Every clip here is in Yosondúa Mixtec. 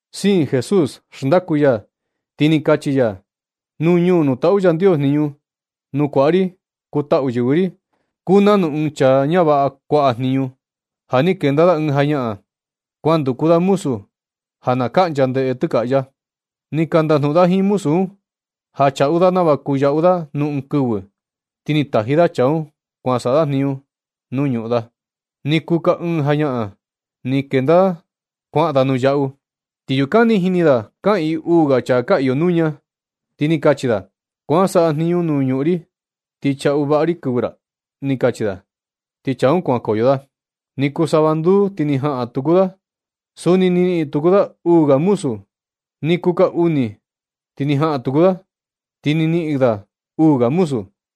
Siin Jesús xndaku ya, ti ni kachi ya: ―Nuu ñuu nuu taꞌu Yandios jniñu, nu kuaꞌa ri kuu taꞌu yɨvɨ ri, kuu nanu ɨɨn chaa ñavaꞌa kuaꞌa jniñu ja ni kenda da ɨɨn jañaꞌan, kuan nduku da muzu ja na kaꞌncha ndeꞌe tɨkaꞌya. Ni ka ndajnuꞌun da jiin muzu un, ja chaꞌu da nava kuu yaꞌu da nuu ɨɨn kɨvɨ. Ti ni taji da chaa un kuan saꞌa da jniñu nuu ñuꞌun da. Ni kuu ka ɨɨn jañaꞌan, ni kenda da kuaꞌan da nuu yaꞌu, ti yukan ni jini da kaꞌiin uu ga chaa ka iyo nuña. Ti ni kachi da: “Kuan saꞌa jniñu nuu ñuꞌun ri ti chaꞌu vaꞌa ri kɨvɨ ra”, ni kachi da. Ti chaa un kuankoyo da. Ni kuu sava nduu, ti ni jaꞌan tuku da. Suni ni niꞌin tuku da uu ga muzu. Ni kuu ka uni ti ni jaꞌan tuku da, ti ni niꞌin da uu ga muzu.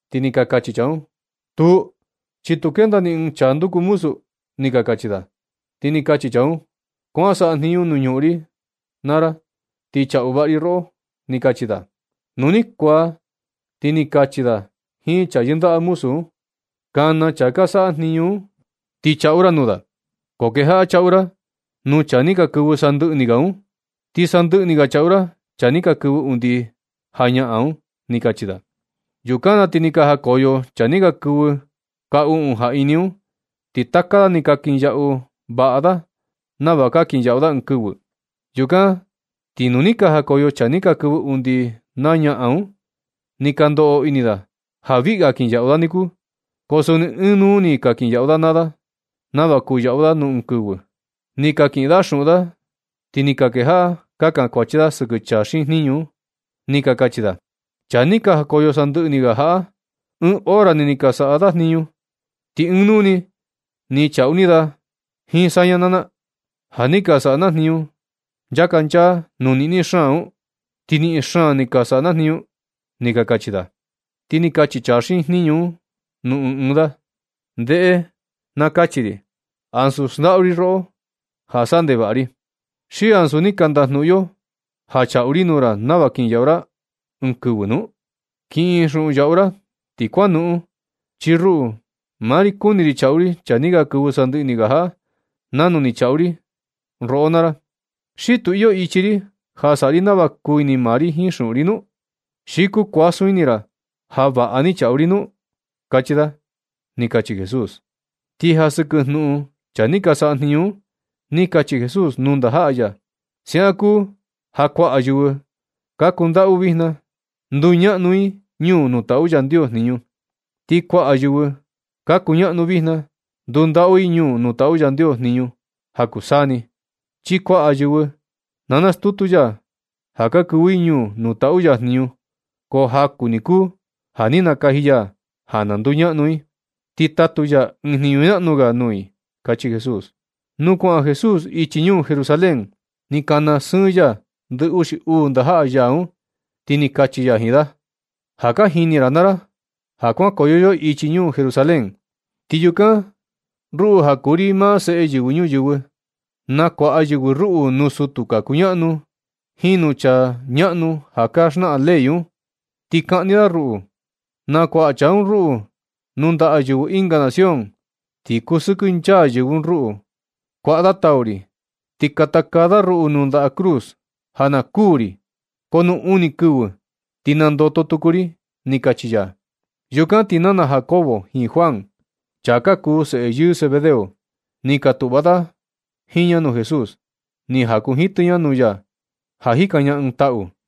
Ti ni ka kachi chaa un: “Tuu, chi tu kenda ni ɨɨn chaa nduku muzu”, ni ka kachi da. Ti ni kachi chaa un: “Kuan saꞌa jniñu nuu ñuꞌun ri un naa ra, ti chaꞌu vaꞌa ri roꞌo”, ni kachi da. Nu ni kuaa, ti ni kachi da jiin chaa yɨndaꞌa muzu un: “Kana chaa ka saꞌa jniñu un, ti chaꞌu ra nuu da, ko kejaꞌa chaꞌu ra nuu chaa ni ka kɨvɨ sandɨꞌɨ ni ga un, ti sandɨꞌɨ ni ga chaꞌu ra chaa ni ka kɨvɨ undi ñaꞌan un”, ni kachi da. Yukan ti ni ka jakoyo chaa ni ka kɨvɨ ka uꞌun jaꞌini un, ti taka da ni ka kinyaꞌu vaꞌa da nava ka kinyaꞌu da ɨɨn kɨvɨ. Yukan ti nu ni ka jakoyo chaa ni ka kɨvɨ undi na ñaꞌan un, ni ka ndoꞌo ini da ja viꞌi ga kinyaꞌu da niku, ko suni ɨɨn nuu ni ni ka kinyaꞌu da naa da nava kuu yaꞌu da nuu ɨɨn kɨvɨ. Ni ka kiꞌin da xuꞌun yaꞌu da un, ti ni ka kejaꞌa ka kankuachi da sɨkɨ chaa xiin jniñu un. Ni ka kachi da: “Chaa ni ka jakoyo sandɨꞌɨ ni ga jaꞌa, ɨɨn hora ni ni ka saꞌa da jniñu, ti ɨɨn nuu ni ni chaꞌu ni da jiin saña naa na, ja ni ka saꞌa jniñu na nchaka nchaa nuu niꞌni xaan un, ti niꞌin xaan ni ka sajniñu na”, ni ka kachi da. Ti ni kachi chaa xiin jniñu un nuu ɨɨn da: “Ndeꞌe naa kachi ri. Ansu xndaꞌu ri roꞌo ja saꞌa ndevaꞌa ri. ¿Xi ansu ni ka ndajnuꞌun yo ja chaꞌu ri nuu ra nava kinyaꞌu ra ɨɨn kɨvɨ nu? Kiꞌin xuꞌun yaꞌu ra ti kuan noꞌon. Chi ruꞌu maa ri, kuni ri chaꞌu ri chaa ni ka kɨvɨ sandɨꞌɨ ni ga jaꞌa, nanu ni chaꞌu ri roꞌo naa ra. ¿Xi tu iyo ichi ri ja saꞌa ri nava kuu ini maa ri jiin xuꞌun ri nu? ¿Xi kuu kuasun ini ra ja vaꞌa ni chaꞌu ri nu”? kachi da ―ni kachi Jesús. Ti ja sɨkɨ jnuꞌun chaa ni ka saꞌa jniñu un, ni kachi Jesús nuu ndajaꞌa ya: ―Ja siaꞌan kuu ja kuaꞌa yɨvɨ ka kundaꞌu vijna, nduñaꞌnu i ñuu nuu taꞌu Yandios jniñu. Ti kuaꞌa yɨvɨ ka kuñaꞌnu vijna ndundaꞌu i ñuu nuu taꞌu Yandios jniñu ja kuu saa ni, chi kuaꞌa yɨvɨ na stutu ya ja ka kɨvɨ i ñuu nuu taꞌu ya jniñu, ko jaku ni kuu ja ni nakaji ya ja na nduñaꞌnu i, ti tatu ya ɨɨn jniñu ñaꞌnu ga nuu i ―kachi Jesús. Nu kuaꞌan Jesús ichi ñuu Jerusalén, ni kana sɨɨn ya ndɨ uxi uu ndajaꞌa ya un, ti ni kachi ya jiin da: ―Ja ka jini ra naa ra ja, ja kuankoyo yo ichi ñuu Jerusalén. Ti yukan ruꞌu, ja kuu ri maa Seꞌe Yɨvɨ Ñuyɨvɨ, nakuaꞌa yɨvɨ ruꞌu nuu sutu ka kuñaꞌnu jiin nuu chaa ñaꞌnu ja ka xnaꞌan ley un, ti kaꞌni da ruꞌu. Nakuaꞌa chaa un ruꞌu nuu ndaꞌa yɨvɨ ɨnga nación, ti kusɨkɨ nchaa yɨvɨ un ruꞌu, kuaꞌa da tau ri, ti katakaa da ruꞌu nuu ndaꞌa cruz, ja na kuū ri. Ko nu uni kɨvɨ ti nandoto tuku ri ―ni kachi ya. Yukan ti nana Jacobo jiin Juan, chaa ka kuu seꞌe yɨɨ Zebedeo, ni ka tuꞌva da jiin ña nuu Jesús, ni jakunjitɨ ña nuu ya ja jikan ña ɨɨn taꞌu.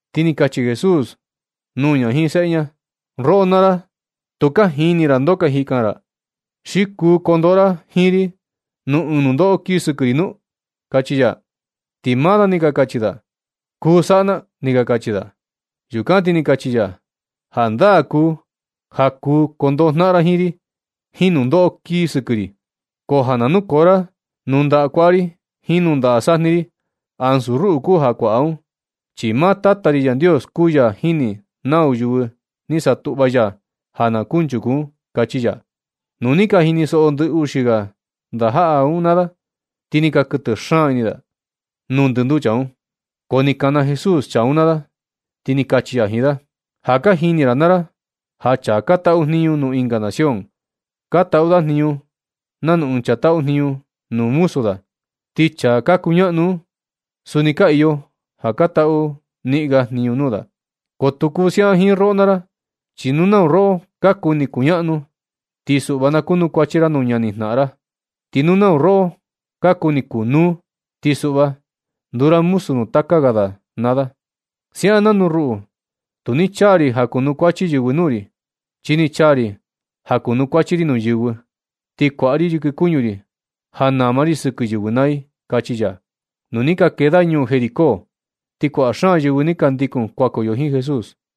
Ti ni kachi Jesús nuu ña jiin seꞌe ña: ―Roꞌo naa ra, tu ka jini ra ndoo ka jikan ra. ¿Xi kuu kondoꞌo ra jiin ri nuu ɨɨn nundoꞌo kii sɨkɨ ri nu? ―kachi ya. Ti maa da ni ka kachi da: ―Kuu saꞌa na ―ni ka kachi da. Yukan ti ni kachi ya: ―Jandaa kuu ja kuu kondoꞌo jnaꞌan ra jiin ri jiin nundoꞌo kii sɨkɨ ri. Ko ja na nukoo ra nundaꞌa kuaꞌa ri jiin nundaꞌa sajni ri, ansu ruꞌu kuu ja kuaꞌa un, chi maa Tata ri Yandios, kuu ya jini nau yɨvɨ ni satuꞌva ya ja na kunchuku un ―kachi ya. Nu ni ka jinisoꞌo ndɨ uxi ga ndajaꞌa un naa da, ti ni ka kɨtɨ xaan ini da nuu ndɨnduu chaa un. Ko ni kana Jesús chaa un naa da, ti ni kachi ya jiin da: ―Ja ka jini ra naa ra, ja chaa ka taꞌu jniñu nuu ɨnga nación, ka taꞌu da jniñu nanu ɨɨn chaa taꞌu jniñu nuu muzu da. Ti chaa ka kuñaꞌnu un, suni ka iyo ja ka taꞌu niꞌin ga jniñu nuu da. Ko tu kuu siaꞌan jiin roꞌo naa ra, chi nu nau roꞌo ka kuni kuñaꞌnu, ti suꞌva na kunukuachi ra nuu ñanijnaꞌan ra. Ti nu nau roꞌo ka kuni kunuu, ti suꞌva nduu ra muzu nuu taka ga da naa da, siaꞌan nanu ruꞌu. Tu ni chaa ri ja kunukuachi yɨvɨ nuu ri, chi ni chaa ri ja kunukuachi ri nuu yɨvɨ, ti nakuaꞌa ri yɨkɨ kuñu ri ja nama ri sɨkɨ yɨvɨ naa i ―kachi ya. Nu ni ka kee da ñuu Jericó, ti kuaꞌa xaan yɨvɨ ni ka ndikun kuankoyo jiin Jesús.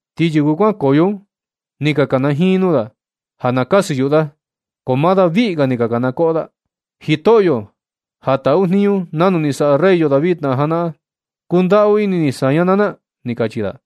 Ti yɨvɨ kuankoyo un ni ka kanajiin nuu da ja na kasɨ yuꞌu da, ko maa da viꞌi ga ni ka kana koꞌo da: ―¡Jitoꞌyo, ja taꞌu ni jniñu nanu ni saꞌa rey yo David na janaꞌan, kundaꞌu ini ni saña naa na! ―kachi da.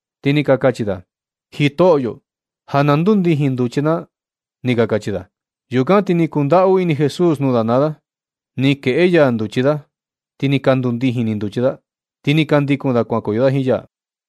Ti ni ka kachi da: ―Jitoꞌyo, ja na ndundijiin nduchi na ―ni ka kachi da. Yukan ti ni kundaꞌu ini Jesús nuu da naa da. Ni kueꞌe ya nduchi da, ti ni ka ndundijin ni nduchi da. Ti ni ka ndikun da kuankoyo da jiin ya.